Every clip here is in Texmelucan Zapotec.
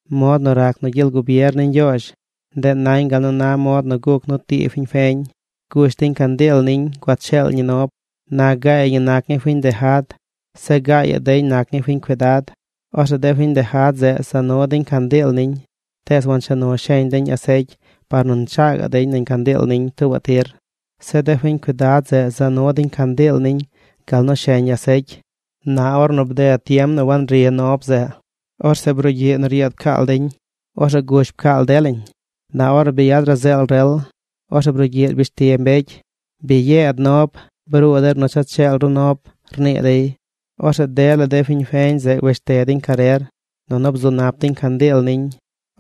’Mod nu rac nu gyel gubier ni Ñgyoozh, ndeꞌ nañ gal nu na mod nu guc nu tii fiñ feñ. Gush deñ candiil niñ gua cheel ñi nob. Na gaay ñi nac ñii fiñ ndeja̱d. Zeꞌ gaayaꞌ deñ nac ñii fiñ cuidad. Orzeꞌ de fiñ ndeja̱d zeꞌ za nu deñ candiil niñ. Tees wancha nu sheñ deñ asecy par nu nchaa gaꞌ deñ nañ candiil niñ tuubaꞌ tir. Zeꞌ de fiñ cuidad zeꞌ za nu deñ candiil niñ gal nu sheñ asecy. Na ornu bded tiem nu wangri nob zeꞌ, orzeꞌ brugyiꞌ nu ryeed pcaal deñ. Orzeꞌ gush pcaal delañ. Na ornu bi yad razeel rel, orzeꞌ brugyiꞌ rbish ti mbecy: “¡Bi yeed nob! ¡Bruu der nu cha cheel ru nob!” rnii dey. Orzeꞌ dela de fiñ feñ zeꞌ wesh te deñ carer, nunu bzu nap deñ candiil niñ.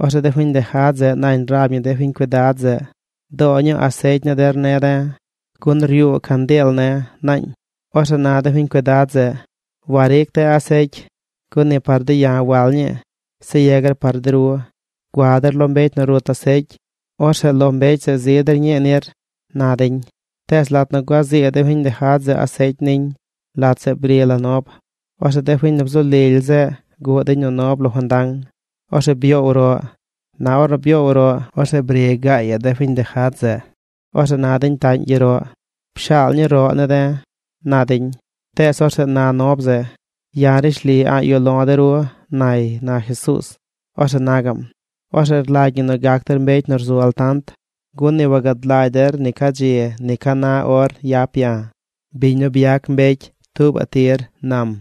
Orzeꞌ de fiñ ndeja̱d zeꞌ nañ rab ñi de fiñ cuidad zeꞌ: “Doo ñuu asecy ni der ne̱ de̱, gun ryuu candiil ne̱”, naañ. Orzeꞌ na de fiñ cuidad zeꞌ: “Waric de̱ asecy. Gun ni par de̱ ya̱ wal ñii, zeꞌ yegar par de ru. Gua der lo mbecy nu rut asecy. Orzeꞌ lo mbecy zeꞌ zi der ñii nir”, na deñ. Tees lat nu gua zii de fiñ ndeja̱d zeꞌ asecy niñ, lat zeꞌ bri la nob. Orzeꞌ de fiñ nu bzu lily zeꞌ guꞌ deñ nu nob lo fandang. Orzeꞌ byoow roꞌ. Na ornu byoow roꞌ, orzeꞌ bri gaayaꞌ de fiñ ndeja̱d zeꞌ. Orzeꞌ na deñ taꞌñ gyeroꞌ: “Pshaal ñuu roꞌ ne̱ de̱”, na deñ. Tees orzeꞌ na nob zeꞌ: “Ya̱ rishli a̱ꞌ yuꞌ lo̱ de ru”, nay ―na Jesuuz. Orzeꞌ na gaꞌm: ―Orzeꞌ rlagy ñi gac der mbecy nu rzu altant, gun ni wagad lagy der ni ca dzi ni ca na or yap ya̱, biñ nu byac mbecy, tuubaꞌ tir ―nam―.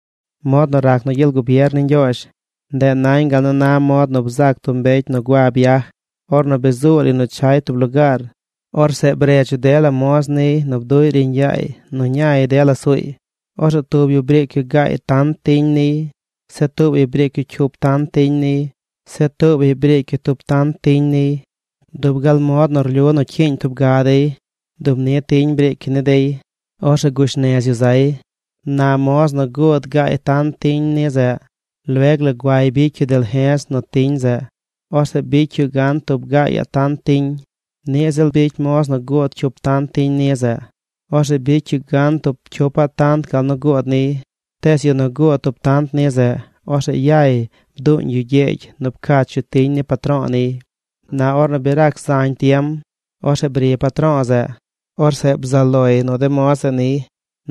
’Mod nu rac nu gyel gubier ni Ñgyoozh, ndeꞌ nañ gal nu na mod nu bzac tub mbecy nu gua biaj. Ornu bi zuu lay nu chay tub lugaar, orzeꞌ bredz yu dela moz niy nu bduꞌy riiñ yaay nu ñay dela suuy. Orzeꞌ tub yu briic yu gaay tant tiñ niy. Zeꞌ tuubaꞌy briic yu cyup tant tiñ niy. Zeꞌ tuubaꞌy briic yu tub tant tiñ niy. Dub gal mod nu rlyu nu cyiiñ tub ga dey dub ni tiñ briic yu ni dey. Orzeꞌ gush nez yu zay. Na moz nu guud gaay tant tiñ ni zeꞌ, lueg la guay bicy yu dalje̱z nu tiñ zeꞌ. Orzeꞌ bicy yu gan tub gaayaꞌ tant tiñ. Niꞌ ziꞌl bicy moz nu guud cyup tant tiñ ni zeꞌ. Orzeꞌ bicy yu gan tub cyupaꞌ tant gal nu guud niy. Tees yu nu guud tub tant ni zeꞌ, orzeꞌ yay bduuñ yu gyegy nu pcach yu tiñ ni patro̱o̱ niy. ’Na ornu bi rac zañ tiem, orzeꞌ bri patro̱o̱ zeꞌ. Orzeꞌ bzaꞌ loy nu de moz zeꞌ niy.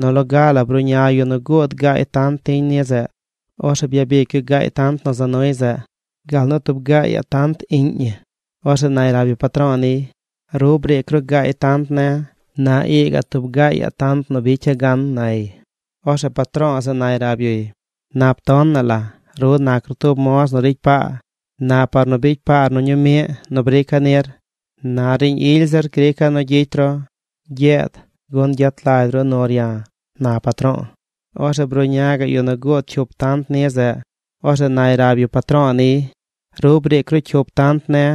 Nu loga la bruꞌña yu nu guud gaay tant tiñ ni zeꞌ. Orzeꞌ byabic yu gaay tant nu za nuy zeꞌ gal nu tub gaayaꞌ tant iꞌñ ñi. Orzeꞌ nay rab yu patro̱o̱ niy: “Ru briic ru gaay tant ne̱. Na ii gaꞌ tub gaayaꞌ tant nu bicya̱ gan”, nay. Orzeꞌ patro̱o̱ zeꞌ nay rab yuy: “Nap tonaꞌ la. Ru nac ru tub moz nu ricy paa. Na par nu bicy paar nu ñuu miꞌ nu briica̱ nir, na riiñ ily zir grica̱ nu gyicy ru. Gyeed gun gyet lagy ru nur ya̱”, na patro̱o̱. Orzeꞌ bruꞌña gaꞌ yu nu guud cyup tant ni zeꞌ. Orzeꞌ nay rab yu patro̱o̱ niy: “Ru briic ru cyup tant ne̱.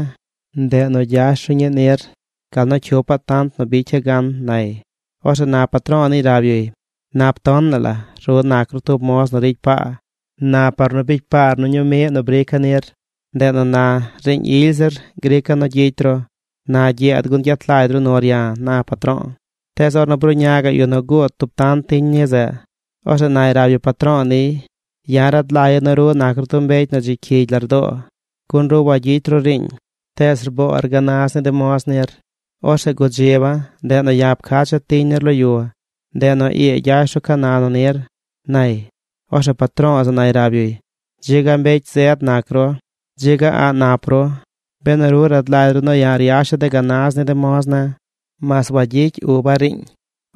Ndeꞌ nu gyash ru ñii nir, gal nu cyupaꞌ tant nu bicya̱ gan”, nay. Orzeꞌ na patro̱o̱ niy rab yuy: “Nap tonaꞌ la. Ru nac ru tub moz nu ricy paa. Na par nu bicy paar nu ñuu miꞌ nu briica̱ nir, ndeꞌ nu na riiñ ily zir grica̱ nu gyicy ru. Na gyeed gun gyet lagy ru nur ya̱”, na patro̱o̱. ’Tees ornu bruꞌña gaꞌ yu nu guud tub tant tiñ ni zeꞌ, orzeꞌ nay rab yu patro̱o̱ niy: “Ya̱ rad lagya̱ nu ru nac ru tub mbecy nu dzi cyigy lardoo. Gun ru wagyicy ru riiñ, tees rboor gana̱z ni de moz nir. Orzeꞌ gudziba̱. Ndeꞌ nu ya̱ pcacha̱ tiñ nir lo yu. Ndeꞌ nu ii gyash ru ca na nu nir”, nay. Orzeꞌ patro̱o̱ zeꞌ nay rab yuy: “Dzi ga mbecy zed nac ru. Dzi ga a̱ꞌ nap ru, benu ru rad lagy ru nu ya̱ ryasha̱ de gana̱z ni de moz ne̱, mas wagyicy uba̱ riiñ.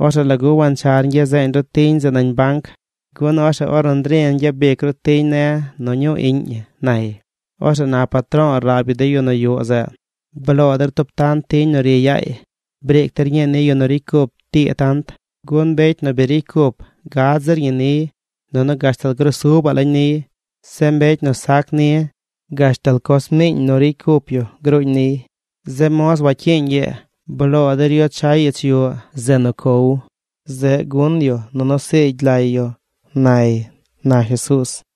Orzeꞌ ¿lagu wanchar ñgya seeñ ru tiñ zeꞌ nañ banc? Gun orzeꞌ ornu ndri̱ gyabic ru tiñ ne̱ nu ñuu iꞌñ ñi”, nay. Orzeꞌ na patro̱o̱ rab yu de yu nu yuꞌ zeꞌ: “Bloo der tub tant tiñ nu ri yaay. Briic der ñii ni yu nu ricy cup tii tant. Gun mbecy nu bi ricy cup gad zir ñi niy nunu gashtal grusubaꞌ lañ niy. Zeꞌ mbecy nu sac ni gashtal coz miiñ nu ricy cup yu gruuñ niy. Zeꞌ moz wacyiiñ ii, bloo der yu chay ich yuꞌ, zeꞌ nu cow. Zeꞌ gun yu nunu siigy lay yu”, nay ―na Jesuuz―.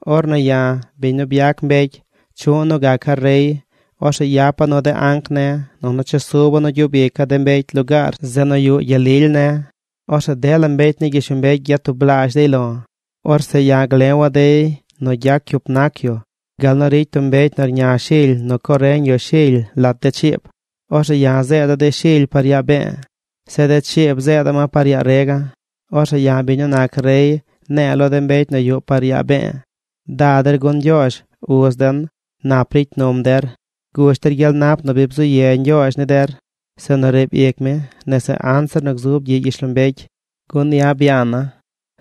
’Ornu ya̱, biñ nu byac mbecy, chuꞌ nu gaca̱ rey, orzeꞌ yapa̱ nu de anc ne̱ nunu chesuba̱ nu gyub ica̱ de mbecy lugaar zeꞌ nu yuꞌ gyel lily ne̱. Orzeꞌ dela mbecy ni gyishlombecy gyatublaazh dey lo̱. Orzeꞌ ya̱ glewa̱ dey nu gyac cyup nac yu gal nu ricy tub mbecy nu rña shily nu co reñ yu shily lat de chiib. Orzeꞌ ya̱ zeeda̱ de shily par yaa be̱e̱. Zeꞌ de chiib zeeda̱ ma par yaa rega̱. Orzeꞌ ya̱ biñ nu nac rey, ne̱e̱ lo de mbecy nu yuꞌ par yaa be̱e̱: “Da der gun Ñgyoozh, uz den, nap ricy num der. Gush der gyel nap nu bi bzu ye Ñgyoozh ni der zeꞌ nu riib ic mi nese anzir nu gzub gyiꞌ gyishlombecy. Gun ya̱ byana̱,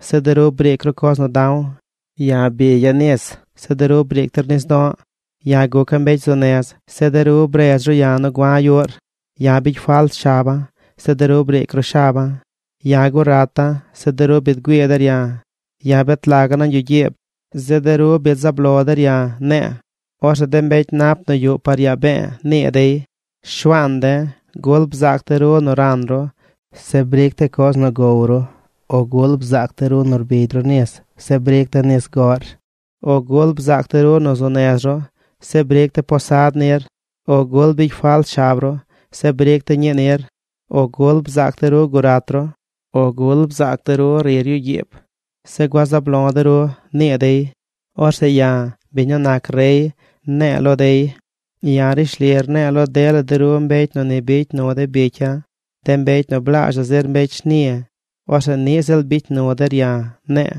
zeꞌ de ru briic ru coz nu da̱w. Ya̱ bigya̱ nis, zeꞌ de ru briic ru nis do̱ꞌ. Ya̱ guca̱ mbecy zu nez, zeꞌ de ru bredz ru ya̱ nu gua̱ yuꞌr. Ya̱ bicy falt shaba̱, zeꞌ de ru briic ru shaba̱. Ya̱ gurata̱, zeꞌ de ru biid güii der ya̱. Ya̱ bet laga̱ nañ yuꞌ gyiib, zeꞌ de ru biid zaab lo der ya̱”, ne̱e̱. Orzeꞌ de mbecy nap nu yuꞌ par yaa be̱e̱ nii dey: “Shuaan de̱, ¿gul bzaac de̱ ru nu ran ru, zeꞌ briic de̱ coz nu gow ru? O ¿gul bzaac de̱ ru nu rbigy ru nis, zeꞌ briic de̱ nis goꞌr? O ¿gul bzaac de̱ ru nu zu nez ru, zeꞌ briic de̱ posad nir? O ¿gul bicy falt shab ru, zeꞌ bric de̱ ñii nir? O ¿gul bzaac de̱ ru gurat ru, o gul bzaac de̱ ru rir yuꞌ gyiib, zeꞌ gua zaab lo de̱ ru?” nii dey. Orzeꞌ ya̱, biñ nu nac rey, ne̱e̱ lo dey: “Ya̱ rishli rne̱e̱ lo dela de ru mbecy nu ni bicy nu de bicya̱, de mbecy nu blaazhaꞌ zir mbecy shni, orzeꞌ niꞌ ziꞌl bicy nu der ya̱”, ne̱e̱.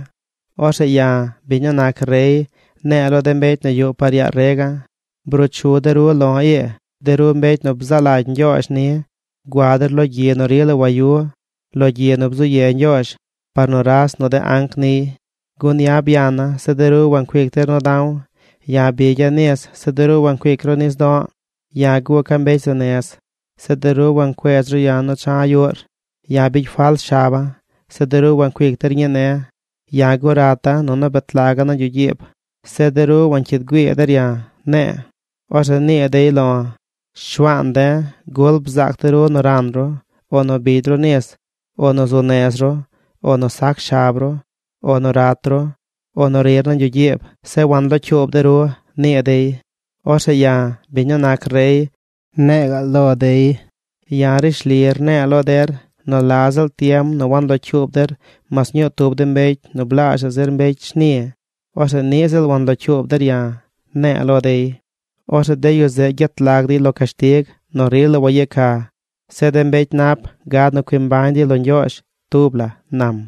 ’Orzeꞌ ya̱, biñ nu nac rey, ne̱e̱ lo de mbecy nu yuꞌ par yaa rega̱: “Bruu chu de ru lo̱ ii, de ru mbecy nu bzaa lagy Ñgyoozh ni. Gua der lo gyi nu rila wayu: lo gyi nu bzu ye Ñgyoozh par nuras nu de anc niy. Gun ya̱ byana̱, zeꞌ de ru wancuic der nu da̱w. Ya̱ bigya̱ nis, zeꞌ de ru wancuic ru nis do̱ꞌ. Ya̱ guca̱ mbecy zu nez, zeꞌ de ru wancuedz ru ya̱ nu cha̱ yuꞌr. Ya̱ bicy falt shaba̱, zeꞌ de ru wancuic der ñii ne̱. Ya̱ gurata̱ nunu betlaga̱ nañ yuꞌ gyiib, zeꞌ de ru wancyiid güii der ya̱”, ne̱e̱. Orzeꞌ nii dey lo̱: “Shuaan de̱, ¿gul bzaac de̱ ru nu ran ru, o nu bigy ru nis, o nu zu nez ru, o nu sac shab ru, o nu rat ru, o nu rir nañ yuꞌ gyiib, zeꞌ wanlocyuub de̱ ru?” nii dey. Orzeꞌ ya̱, biñ nu nac rey, ne̱e̱ ga̱ꞌ lo dey: “Ya̱ rishli rne̱e̱ lo der nu la ziꞌl tiem nu wanlocyuub der mas ñuu tub de mbecy nu blaazhaꞌ zir mbecy shni, orzeꞌ niꞌ ziꞌl wanlocyuub der ya̱”, ne̱e̱ lo dey. Orzeꞌ de yu zeꞌ gyet lag dey lo cashtig nu rila wayeca. Zeꞌ de mbecy nap gad nu cui mbañ dey lo Ñgyoozh tub la ―nam.